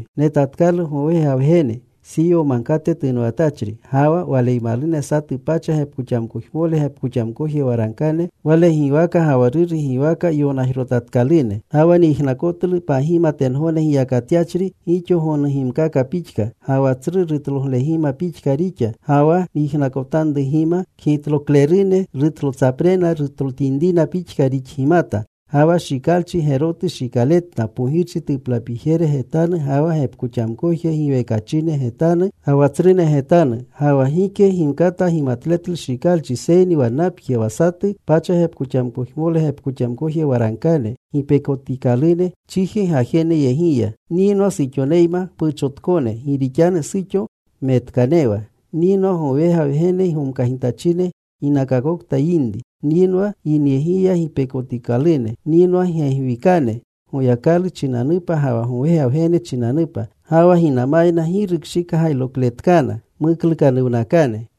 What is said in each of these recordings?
Netatkalu Gowega Wgene Siyo Magkate tunwatachri. Ga wa Waleymalune satu pacha gepkoxamkojmole gepkoxamkoje waragkane, Wale giwaka ga wa Ruru giwaka yonajrotatkalune. Ga wa nyijnakotlu pagima tengogne giyakatyachri, gixo gonugimkaka pixka. Ga wa tsru rutloglegima pixka rixa. Ga wa nyijnakotanrugima, kgitloklerune rutlotsaprena rutlotinrina pixka rixgimata. Ga wa shikalchi gerotu shikaletna, pogirchi tuplapijere getanu ga wa gepkoxamkoje giwekachine getanu ga wa tsrune getanu. Ga wa gike gimkata gimatletlu shikalchi seyni wannapje, wa satu pacha gepkoxamkojmole gepkoxamkoje waragkane, gipekotikalune chiji gajeneyegiya. Nyinwa suxoneyma mpuchotkone, gi rixanu suxo metkanewa. Nyinwa gowega Wgene gomkagitachine ginakakokta yinri. Nyinwa yinyegiya gipekotikalune. Nyinwa gegwikane Goyakalu chinanupa ga wa gowega Wgene chinanupa. Ga wa ginamayna gi rukshigayrokletkana. Muklukanuwnakane.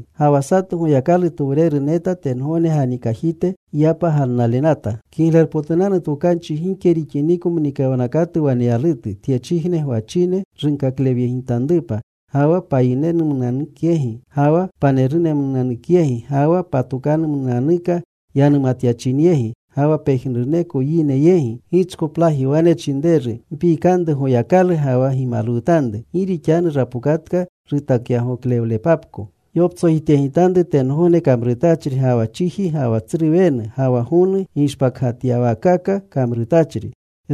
Ga wa satu Goyakalutowreru neta tengogne ganikajite yapa galnalenata. Kiglerpotunanu Tokanchi gike rixiniko mnikawnakatu waneyalutu, tyechijne gwachine runkakleyegitanrupa, ga wa payinemnunanukyegi, ga wa panerumnunanukyegi, ga wa patokanumnunanuka yanumatyachinyegi, ga wa pejnuruneko yine yegi. Gichkoplaji wane chinreru, “Mpikanru Goyakalu ga wa gimalwutanru. Gi rixanu rapokatka rutakyagoklewlepapko. Gyoptsojityegitanru tengogne kamrutachri, ga wa chiji, ga wa tsru wenu, ga wa gonu gishpakgatyawaakaka kamrutachri.”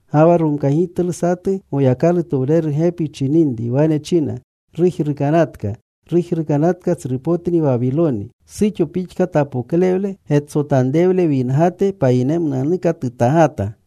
Ga wa romkagitlu satu Goyakalutowreru gepi chininri. Wane china, “Rujrukanatka. Rujrukanatka tsrupotni Wawiloni. Suxo pixka tapoklewle getsotanrewle wingate, payinemnunanuka tutagata.”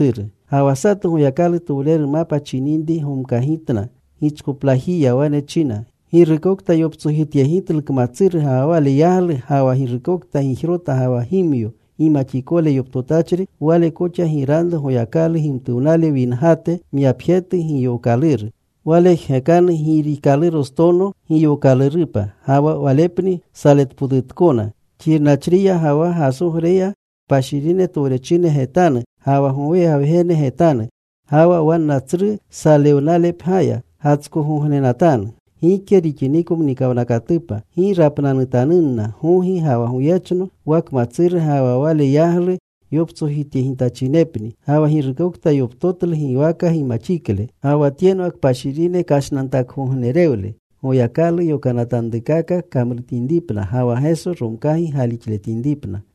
Ga wa satu Goyakalutowreru mapa chininri gomkagitna. Gichkoplajiya wane china, “Girukokta yoptsojityegitlu kmatsuru ga wa wale yaglu, ga wa girukokta gijrota ga wa gimyo gimaxikole yoptotachri, wale koxa giranru Goyakalu gimtuwnale wingate, myapjetu giyookaluru. Wale jgekanu girikalurostono giyookalurupa. Ga wa walepni saletpotutkona xirnachriya ga wa gasogreya kpashirine towrechine getanu, ga wa gowega Wgene getanu. Ga wa wanna tsru salewnalepgya gatskogognenatanu gike rixiniko mnikawnakatupa. Gi rapnanutanunna gogi ga wa goyechno, wa kmatsuru ga wa wale yaglu yoptsojityegitachinepni, ga wa girukokta yoptotlu giwaka gimaxikle.” Ga wa tyenwa kpashirine kashnantakgognerewle: Goyakalu yokanatanrukaka kamrutinripna ga wa Geso romkagi galixletinripna.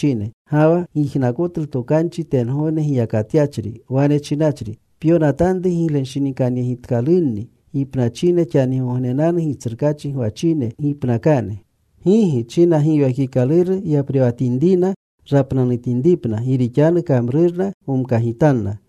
Ga wa nyijnakotlu tokanchi tengogne giyakatyachri, wane chinachri, “Pyonatanru: Giglenshinikanyegitkalunni gipnachine xanigognenanu, Gitsrukaachi gwachine gipnakane.” “Gigi,” china Giwekikaluru, “yaprewatinrina rapnanutinripna. Gi rixanu kamrurna gomkagitanna.”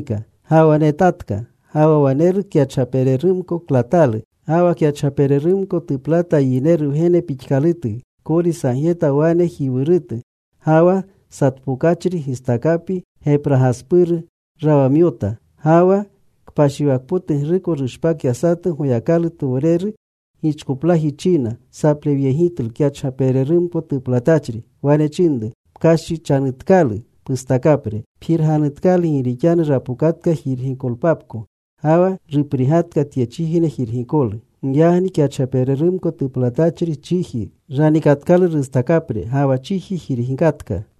Ga wa netatka. Ga wa waneru kyachgapererumko klatalu. Ga wa kyachgapererumko tuplata yineru Wgene pixkalutu, kori sagyeta wanejiwurutu. Ga wa satpokachri gistakapi gepragaspuru rawamyota. Ga wa kpashiwakpotugruko rushpakya satu Goyakalutowreru. Gichkoplaji china saplewyegitlu kyachgapererumko tuplatachri. Wane chinru, “Pkashichanutkalu pustakapre. Pjirganutka. Gi rixanu rapokatka jirgikolpapko. Ga wa ruprigatka tyechijne jirgikolu.” Giyagni kyachgapererumko tuplatachri chiji ranikatkalu rustakapre. Ga wa chiji jirgakatka.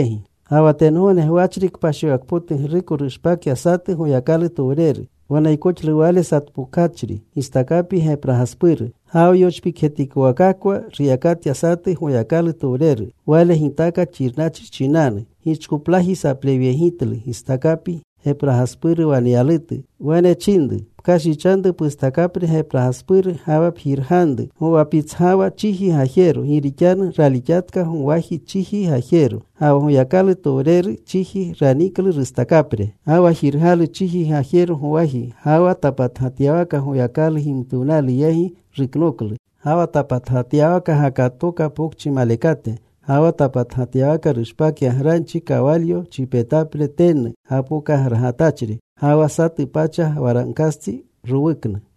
Ga wa tengogne gwachri kpashiwakpotugruko rushpakya satu Goyakalutowreru. Waneykoxlu wale satpokachri gistakapi gepragaspuru. Ga wa yochpikjetikowakakwa ruyakatya satu Goyakalutowreru. Wale gitaaka xirnachri chinanu. Gichkoplaji saplewyegitlu gistakapi gepragaspuru waneyalutu. Wane chinru, “Pkashichanru pustakapre gepragaspuru, ga wa pjirganru gowapitsgawa chiji gajero. Gi rixanu ralixatka gowaji chiji gajero.” Ga wa Goyaklalutowreru chiji raniklu rustakapre. Ga wa jirgalu chiji gajero gowaji. Ga wa tapatgatyawaka Goyakalu gimtuwnalu yegi, ruknoklu. Ga wa tapatgatyawaka gakatooka pokchi malekate. Ga wa tapatgatyawaka rushpakya granchi, kawalyo chipetapre tennu gapokagragatachri, ga wa satu pacha waragkastsi rowuknu.